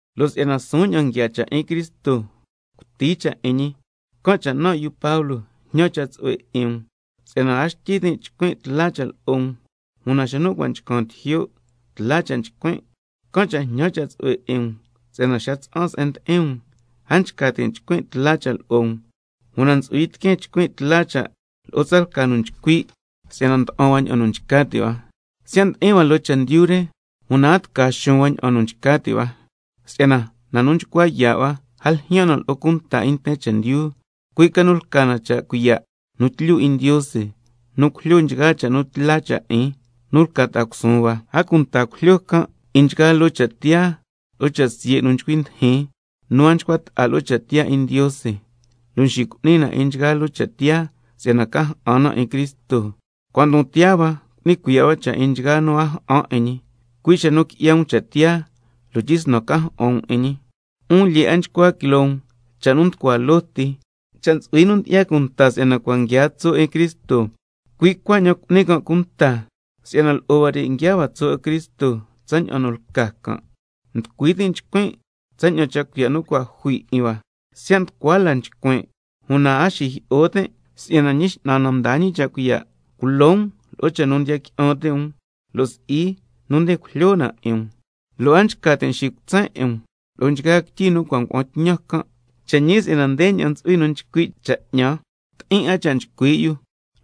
Lo' si'yana suun ña'an nguiaa cha' 'in Cristo, cuti cha' 'in ñi, can' cha' nan' yu Pablo jñan cha' tsu'hue 'in um, si'yana a xtyi tin' chcuin' tla cha' lo'o um, una xa nu cua' nchcan tijyo' tla cha' chcuin', can' cha' jñan cha' tsu'hue 'in um si'yana xa tsa'an se'en ndi'in um, a nchca tin' chcuin' tla cha' lo'o um, una ntsu'hui tiqueen chcuin' tla cha' lo'o tsalca nu nchcui' si'yana nda'an hua ña'an nu nchca ti' hua. Siya' ndi'in hua loo chendyu re, una a tca xuun hua ña'an nu nchca ti' hua, si'yana na nu nchcua yaa' hua, a ljyaan na lo'o cha' cuiya' 'in nten chendyu, cui' ca nu lca na sca cha' cuiya' nu tlyu 'in Ndiose nu cujlyo 'in nchgaa cha' nu tla cha' 'in nu lca ta'a cusuun hua. A cunta cujlyo can' 'in nchgaa loo cha' tiyaa lo'o cha' siye' nu nchcui ndijin, nu a nchcua ta'a lo'o cha' tiyaa 'in Ndiose, lo' xicu'ni na nchgaa loo cha' tiyaa si'yana ca ja'an na 'in Cristo, cua' ndon tiyaa hua cu'ni cuiya' hua 'in nchgaa nu a ja'an 'in ñi, cui' xa nu qui'ya um cha' tiyaa lo' tyisnan ca ja'an um 'in ñi. 'Un lyee 'a nchcua quiloo um cha' nu nducua loo ti. Cha' ntsu'hui nu ndyi'ya cunta si'yana cua' nguiaa tso' 'in Cristo, cui' cuaña'an cu'ni can' cunta si'yana lo'o huare' nguiaa hua tso' 'in Cristo tsaña'an nu lca can'. Nducui tin' chcuin' tsaña'an cha' cuiya' nu cua' jui 'in hua, siya' nducua la cha' nchcuin', una a xijyi'o tin' si'yana Ñi X'nan na mdaa ñi cha' cuiya' culo um lo'o cha' nu ndiya qui'an ti' um lo' si'i nu nde cujlyo na 'in um, a nchca tin' xicutsen 'in um lo'o nchgaa quityi nu cua' ngua'an tñan can'. Cha' ñi si'yana ndeña'an ntsu'hui nu nchcui' cha' 'ñan: Ti'in 'a cha' nchcui' yu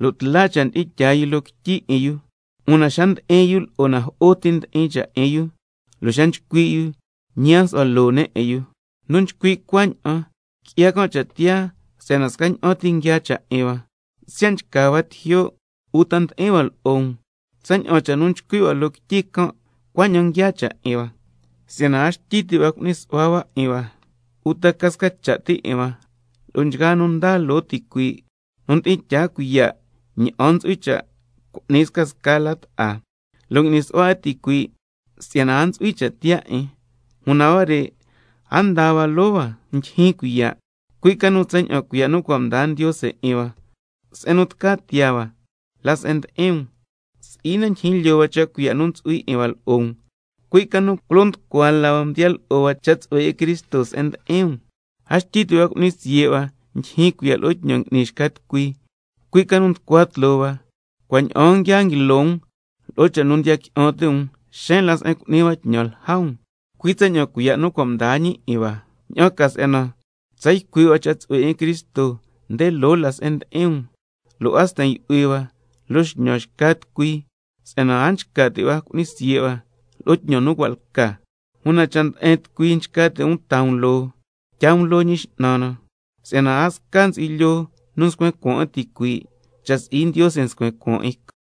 lo' tla cha' ndi'in tyaa yu loo quityi 'in yu, una xa ndi'in yu lo'o na jo'o ti ndi'in cha' 'in yu, lo' xa nchcui' yu ñi a nsu'hua loo ne' 'in yu. Nu nchcui' cuaña'an qui'ya can' cha' tiyaa si'yana scaña'an ti nguiaa cha' 'in hua, siya' nchca hua tijyo' uta ndi'in hua lo'o um. Tsaña'an cha' nu nchcui' hua loo quityi can' cuaña'an nguiaa cha' 'in hua. Si'yana a xtyi ti' hua cu'ni su'hua hua 'in hua, uta ca sca cha' ti 'in hua lo'o nchgaa nu ndaa loo ticuii', nu ndi'in tyaa cuiya' ña'an ntsu'hui cha' cu'ni scasca la ta'a, lo' ngui'ni su'hua 'in ticuii', si'yana a ntsu'hui cha' tiyaa 'in. Una huare' a ndaa hua loo hua ndyijyin cuiya', cui' ca nu tsaña'an cuiya' nu cua' mdaa Ndiose 'in hua, se'en nu tca tiyaa hua la se'en ndi'in um. Si'i na ndijin lyoo hua cha' cuiya' nu ntsu'hui 'in hua lo'o um, cui' ca nu culo nducua la hua mdiya lo'o hua cha' tsu'hue 'in Cristo se'en ndi'in um. A xtyi ti' hua cu'ni siye' hua ndyijyin cuiya' lo'o tñan ngui'ni xca tucui, cui' ca nu nducua tloo hua, cua' ña'aan nguia nguilo um lo'o cha' nu ndiya qui'an ti' um, xeen la se'en cu'ni hua tñan lja um, cui' tsaña'an cuiya' nu cua' mdaa ñi 'in hua, ña'an ca si'yana tsa ycui' hua cha' tsu'hue 'in Cristo nde loo la se'en ndi'in um, lo' a sten yu'hui hua loo xñan xca tucui si'yana a nchca ti' hua cu'ni siye' hua lo'o tñan nu cua' lca. Una, —cha' nde'en tucui nchca ti' um taa um loo, tyaa um loo 'in Ñi X'nan na—, si'yana a sca ntsu'hui lyoo nu nscuen cuaan 'in ticuii', cha' si'i Ndiose scuen cuaan 'in can'.